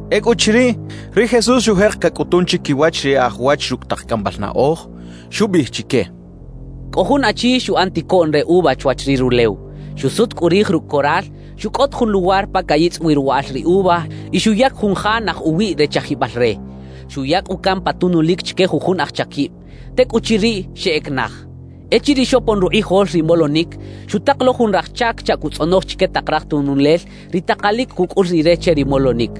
Ecꞌuchiriꞌ, ri Jesús xujek cacꞌutun chiquiwach ri e aj wach rucꞌ tak cꞌambal naꞌoj, xubiꞌij chique: «Cꞌo jun achi xuꞌan ticoꞌn re uva chwach ri rulew. Xusut cꞌu rij rucꞌ coral, xucꞌot jun luwar pa cayitzꞌ wi ruwaꞌal ri uva y xuyac jun ja naj uwiꞌ re chajibal re. Xuya cꞌu can pa tunulic chique jujun aj chaquib. Tecꞌuchiriꞌ, xeꞌec naj. »Echiriꞌ xopon rukꞌijol ri molonic, xutak lo jun raj chac chaꞌ cuꞌtzꞌonoj chique tak raj tunulel ri takalic cucꞌul rire che ri molonic.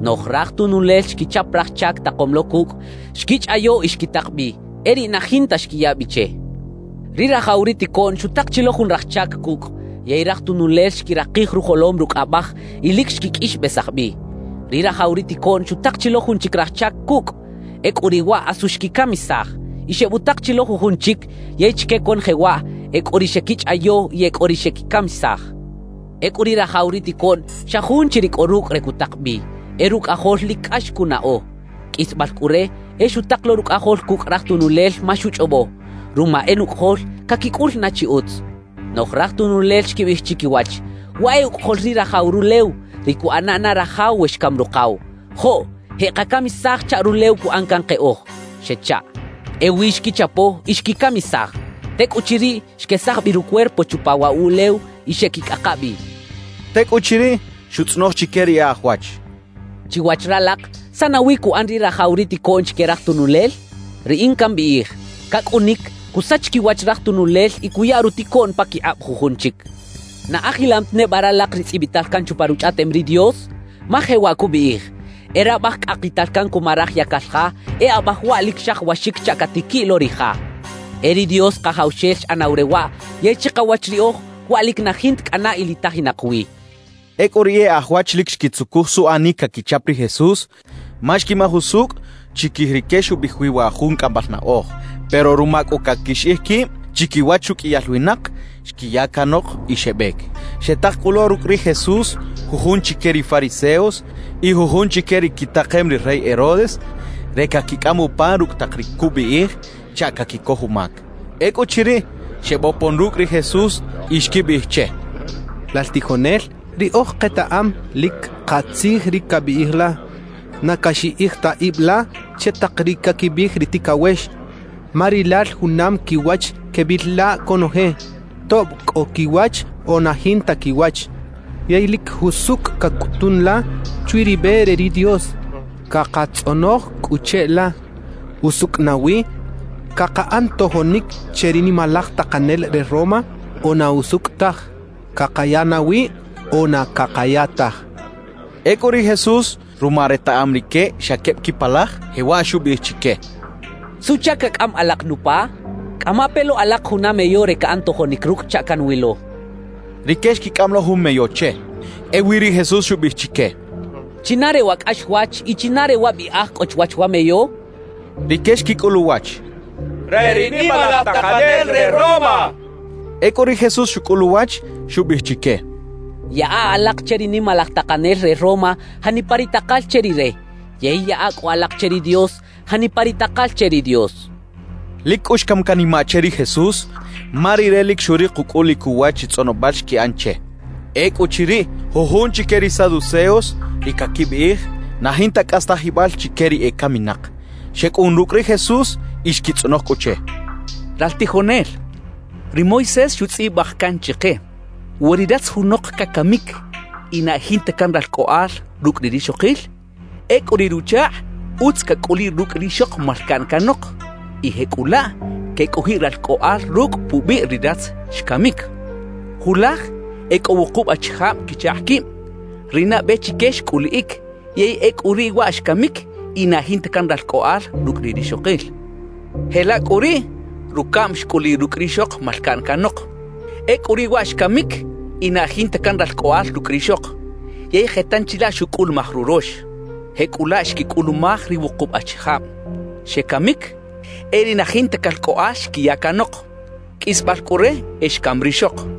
Noꞌj raj tunulel xquichap raj chac takom lo cucꞌ, xquichꞌayo y xquitak bi; e riꞌ na jinta xquiya bi che. »Ri rajaw ri ticoꞌn xutak chi lo jun raj chac cucꞌ, yey raj tunulel xquirakij rujolom rucꞌ abaj y lic xquiqꞌuixbesaj bi. Ri rajaw ri ticoꞌn xutak chi lo jun chic raj chac cucꞌ; ecꞌu riꞌ waꞌ asu xquicamisaj. Y xebutak chi lo jujun chic; yey chique conoje waꞌ, e cꞌo ri xequichꞌayo y e cꞌo ri xequicamisaj. »Ecꞌu ri rajaw ri ticoꞌn xa jun chi ri cꞌo rucꞌ re cutak bi, e rucꞌajol lic cꞌax cunaꞌo. Qꞌuisbal cꞌu re, e xutak lo rucꞌajol cucꞌ raj tunulel ma xuchꞌobo: “Ruma e nucꞌajol, caquicꞌul na chi utz.” »Noꞌj raj tununel xquibiꞌij chiquiwach: “Waꞌ e ucꞌajol ri rajaw rulew, ri cuꞌana na rajaw we xcam rukaw. Joꞌ, jeꞌkacamisaj chaꞌ rulew cuꞌan can keꞌoj” xechaꞌ. Ewi xquichapo y xquicamisaj. Tecꞌuchiriꞌ, xquesaj bi rucuerpo chupa waꞌ wuꞌlew y xeꞌquicꞌaka bi» xcha ri Jesús. Tecꞌuchiriꞌ, xutzꞌonoj chique ri e aj wach: —Chiwach ralak, ¿saꞌ nawi cuꞌan ri rajaw ri ticoꞌn chique raj tunulel? Riꞌin cambiꞌij: Cacꞌunic, cusach quiwach raj tunulel y cuya ruticoꞌn paquikꞌab jujun chic. »¿Na ajilam ta neba ralak ri tzꞌibital can chupa Ruchꞌaꞌtem ri Dios? Ma jewaꞌ cubiꞌij: E rabaj cꞌakital can cuma raj yacal ja, e abaj waꞌ lic xajawaxic chaꞌ catiquiꞌ lo ri ja. E ri Dios Kajawxel xꞌanaw re waꞌ, yey chikawach riꞌoj, waꞌ lic na jinta cꞌana ilitajinak wi —xchaꞌ. Ecꞌu ri e aj wach lic xquitzucuj suꞌanic caquichap ri Jesús ma xquimaj usucꞌ chiquij rique xubiꞌij wi wa jun cꞌambal naꞌoj. Pero ruma cꞌu caquixiꞌij quib chiquiwach ruqꞌuiyal winak, xquiya canok y xebec. Xetak cꞌu lo rucꞌ ri Jesús jujun chique ri fariseos y jujun chique ri quitakem ri rey Herodes, re caquicꞌam upa rucꞌ tak ri cubiꞌij chaꞌ caquicoj umac. Ecꞌuchiriꞌ, xebopon rucꞌ ri Jesús y xquibiꞌij che: —Lal tijonel, riꞌoj ketaꞌam lic katzij ri cabiꞌij la. Na caxiꞌij ta ib la che tak ri caquibiꞌij ri ticawex, ma rilal junam quiwach quebil la conoje, tob cꞌo quiwach o na jinta quiwach; yey lic jusucꞌ cacꞌutun la chwi ri be re ri Dios. Cakatzꞌonoj cꞌu cheꞌla: ¿Usucꞌ nawi cakaꞌan tojonic che ri nimalaj takanel re Roma o na usucꞌ taj? ¿Cakaya nawi o na cakaya taj? —xechaꞌ. Ecꞌu ri Jesús, ruma retaꞌam rique xa queb quipalaj, jewaꞌ xubiꞌij chique: —¿Suꞌchac cacꞌam alak nupa? Cꞌama pe lo alak juna meyo re caꞌan tojonic rucꞌ chaꞌ canwilo —xchaꞌ. Rique xquicꞌam lo jun meyo che. Ewi ri Jesús xubiꞌij chique: —¿China re wa cꞌaxwach y china re wa biꞌaj cꞌo chwach wa meyo? —xchaꞌ. Rique xquicꞌul uwach: —Re ri nimalaj takanel re Roma —xechaꞌ. Ecꞌu ri Jesús xucꞌul uwach, xubiꞌij chique: —Yaꞌa alak che ri nimalaj takanel re Roma janipa ri takal che rire, yey yaꞌa cꞌu alak che ri Dios janipa ri takal che ri Dios —xchaꞌ. Lic cꞌu xcam canimaꞌ che ri Jesús ma Rire lic xurik ucꞌulic uwach ri tzꞌonobal xquiꞌan che. Ecꞌuchiriꞌ, jujun chique ri saduceos, ri caquibiꞌij na jinta cꞌastajibal chique ri ecaminak, xecꞌun rucꞌ ri Jesús y xquitzꞌonoj cꞌu che: —Lal tijonel, ri Moisés xutzꞌibaj can chike: “We ri ratz junok cacamic y na e jinta can ralcꞌoꞌal rucꞌ ri rixokil, ecꞌu riꞌ ruchakꞌ utz cacꞌuliꞌ rucꞌ rixok malcaꞌn canok y jecꞌulaꞌ quecꞌojiꞌ ralcꞌoꞌal rucꞌ pubiꞌ ri ratz xcamic” xchaꞌ. »Julaj e cꞌo wukub achijab quichakꞌ quib. Ri nabe chique xcꞌuliꞌic, yey ecꞌu riꞌ waꞌ xcamic y na e jinta can ralcꞌoꞌal rucꞌ ri rixokil. Jelaꞌ cꞌu riꞌ rucaꞌm xcꞌuliꞌ rucꞌ rixok malcaꞌn canok. Ecꞌu riꞌ waꞌ xcamic y na e jinta can ralcꞌoꞌal rucꞌ rixok. Yey je tanchi laꞌ xucꞌulumaj rurox. Jecꞌulaꞌ xquicꞌulumaj ri wukub achijab; xecamic, e riꞌ na jinta calcꞌoꞌal xquiya canok. Qꞌuisbal cꞌu re, e xcam rixok.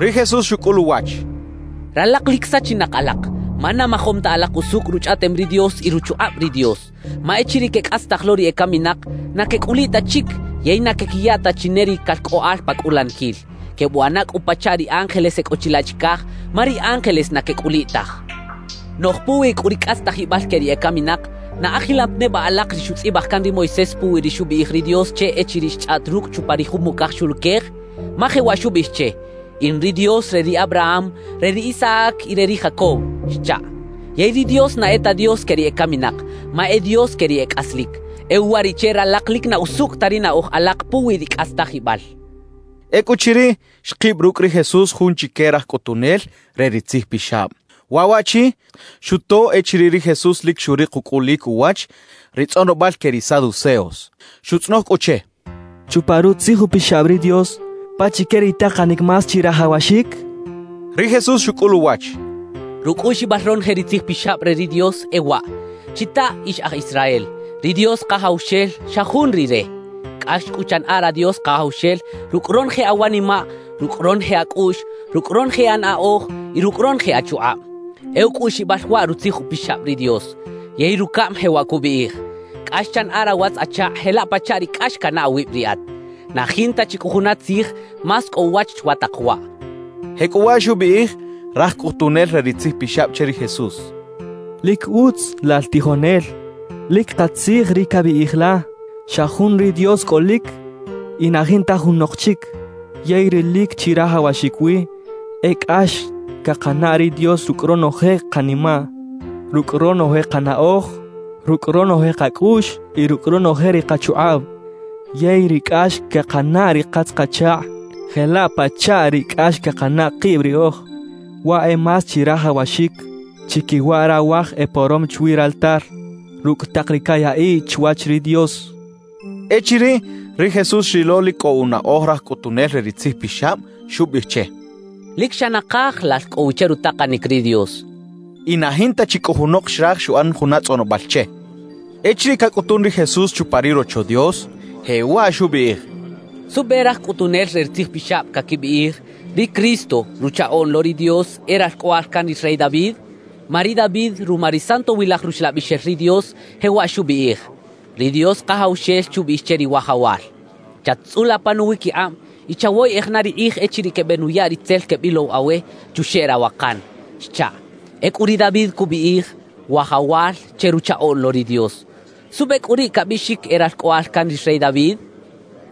Ri Jesús xucꞌul uwach: —Ralak lic sachinak alak, ma na majom ta alak usucꞌ Ruchꞌaꞌtem ri Dios y ruchukꞌab ri Dios. Ma echiriꞌ quecꞌastaj lo ri ecaminak, na quecꞌuliꞌ ta chic yey na quequiya ta chi ne ri calcꞌoꞌal pa cꞌulaniquil; quebuꞌana cꞌu pachaꞌ ri ángeles e cꞌo chilaꞌ chicaj, ma ri ángeles na quecꞌuliꞌ taj. »Noꞌj puwi cꞌu ri cꞌastajibal que ri ecaminak, ¿na ajilam ta neba alak ri xutzꞌibaj can ri Moisés puwi ri xubiꞌij ri Dios che echiriꞌ xchꞌaꞌt rucꞌ chupa ri jumocaj xuluquej? Ma jewaꞌ xubiꞌij che: “In ri Dios re ri Abraham, re ri Isaac y re ri Jacob” xchaꞌ. Yey ri Dios na e ta Dios que ri ecaminak, ma e Dios que ri e cꞌaslic. E uwariꞌche ralak lic na usucꞌ ta ri naꞌoj alak puwi ri cꞌastajibal —xchaꞌ. Ecꞌuchiriꞌ, xkib rucꞌ ri Jesús jun chique raj cꞌutunel re ri tzijpixab. Waꞌ waꞌchi xuto echiriꞌ ri Jesús lic xurik ucꞌulic uwach ri tzꞌonobal que ri saduceos. Xutzꞌonoj cꞌu che: —Chupa Rutzij Upixab ri Dios, ¿pachique ri takanic más chirajawaxic? —xchaꞌ. Ri Jesús xucꞌul uwach: —Rucꞌuꞌxibal ronoje ri Tzij Pixab re ri Dios e waꞌ: Chitaꞌ, ix aj Israel; ri Dios Kajawxel, xa jun Rire. Cꞌax cꞌu chanaꞌa ra Dios Kajawxel rucꞌ ronoje awanimaꞌ, rucꞌ ronoje acꞌuꞌx, rucꞌ ronoje anaꞌoj y rucꞌ ronoje achukꞌab. E ucꞌuꞌxibal waꞌ Rutzij Upixab ri Dios. Yey rucaꞌm jewaꞌ cubiꞌij: Cꞌax chanaꞌa rawatz-achakꞌ jelaꞌ pachaꞌ ri cꞌax canaꞌ awib riꞌat. Na jinta chi cꞌu juna tzij más cꞌo uwach chwa tak waꞌ —xchaꞌ. Jecꞌuwaꞌ xubiꞌij raj cꞌutunel re ri tzijpixab che ri Jesús: —Lic utz, lal tijonel; lic katzij ri cabiꞌij la: “Xa jun ri Dios cꞌolic y na jinta junok chic.” Yey ri lic chirajawaxic wi e cꞌax cakanaꞌ ri Dios rucꞌ ronoje kanimaꞌ, rucꞌ ronoje kanaꞌoj, rucꞌ ronoje kacꞌuꞌx y rucꞌ ronoje ri kachukꞌab; yey ri cꞌax quekanaꞌ ri katz-kachakꞌ jelaꞌ pachaꞌ ri cꞌax cakanaꞌ kib riꞌoj. Waꞌ e más chirajawaxic chiquiwa rawaj eporom chwi raltar rucꞌ tak ri cayaꞌiꞌ chwach ri Dios —xchaꞌ. Echiriꞌ ri Jesús xrilo lic cꞌo unaꞌoj raj cꞌutunel re ri tzijpixab, xubiꞌij che: —Lic xa nakaj lal cꞌo wi che rutakanic ri Dios —xchaꞌ. Y na jinta chi cꞌu junok xraj xuꞌan juna tzꞌonobal che. Echiriꞌ cacꞌutun ri Jesús chupa ri Rocho Dios, jewaꞌ xubiꞌij: —¿Suꞌbe raj cꞌutunel re ri tzijpixab caquibiꞌij: “Ri Cristo, Ruchaꞌoꞌn lo ri Dios, e Ralcꞌoꞌal can ri rey David”? Ma ri David, ruma ri Santowilaj Ruxlabixel ri Dios, jewaꞌ xubiꞌij: Ri Dios Kajawxel xubiꞌij che ri Wajawal: “Chat-tzꞌula pa nuwiquikꞌab, y chawoyeꞌej na ri kꞌij echiriꞌ quebenuya ri tzel quebilow awe chuxeꞌ rawakan” xchaꞌ. Ecꞌu ri David cubiꞌij “Wajawal” che Ruchaꞌoꞌn lo ri Dios. ¿Suꞌbe cꞌu riꞌ cabiꞌxic e Ralcꞌoꞌal can ri rey David? —xchaꞌ.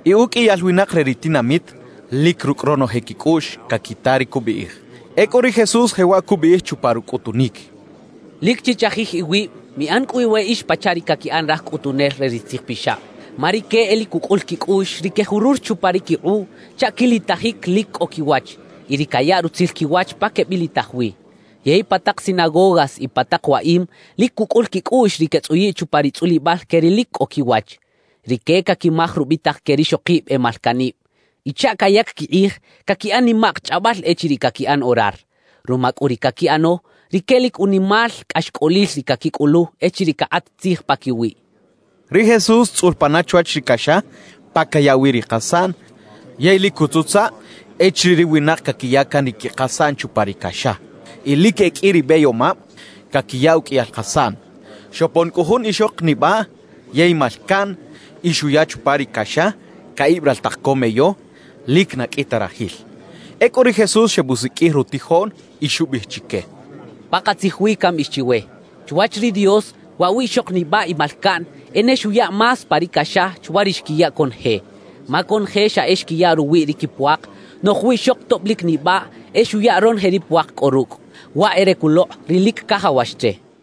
Y uqꞌuiyal winak re ri tinamit lic rucꞌ ronoje quicꞌuꞌx caquita ri cubiꞌij. Ecꞌu ri Jesús jewaꞌ cubiꞌij chupa rucꞌutunic: «Lic chichajij iwib; miꞌan cꞌu iweꞌix pachaꞌ ri caquiꞌan raj cꞌutunel re ri tzijpixab. Ma rique e lic cucꞌul quicꞌuꞌx ri quejurur chupa ri quikꞌuꞌ chaꞌ quilitajic lic cꞌo quiwach y ri cayaꞌ rutzil quiwach pa quebilitaj wi. Yey pa tak sinagogas y pa tak waꞌim lic cucꞌul quicꞌuꞌx ri quetzꞌuyiꞌ chupa ri tzꞌulibal que ri lic cꞌo quiwach. Rique caquimaj rubitak que rixokib e malcaꞌnib. Y chaꞌ cayac quikꞌij, caquiꞌan nimak chꞌabal echiriꞌ caquiꞌan orar. Ruma cꞌu ri caquiꞌano, rique lic unimal cꞌaxcꞌolil ri caquicꞌulu echiriꞌ cakꞌat tzij paquiwiꞌ» cachaꞌ. Ri Jesús tzꞌul pana chwach ri caxa pa cayaꞌ wi ri kasaꞌn yey lic cutzutzaꞌ echiriꞌ ri winak caquiya can ri quikasaꞌn chupa ri caxa. Y lic e qꞌui ri beyomab caquiya uqꞌuiyal kasaꞌn. Xopon cꞌu jun ixok nibaꞌ yey malcaꞌn y xuya chupa ri caxa caꞌib raltak co meyo lic na qꞌui ta rajil. Ecꞌu ri Jesús xebusiqꞌuij rutijoꞌn y xubiꞌij chique: —Pakatzij wi cambiꞌij chiwe: Chwach ri Dios, waꞌ wiꞌxok nibaꞌ y malcaꞌn, e ne xuya más pa ri caxa chwa ri xquiya conoje. Ma conoje xa e xquiya ruwiꞌ ri quipuak; noꞌj wiꞌxok tob lic nibaꞌ e xuya ronoje ri puak cꞌo rucꞌ, waꞌ e re culokꞌ ri lic cajawax che —xchaꞌ.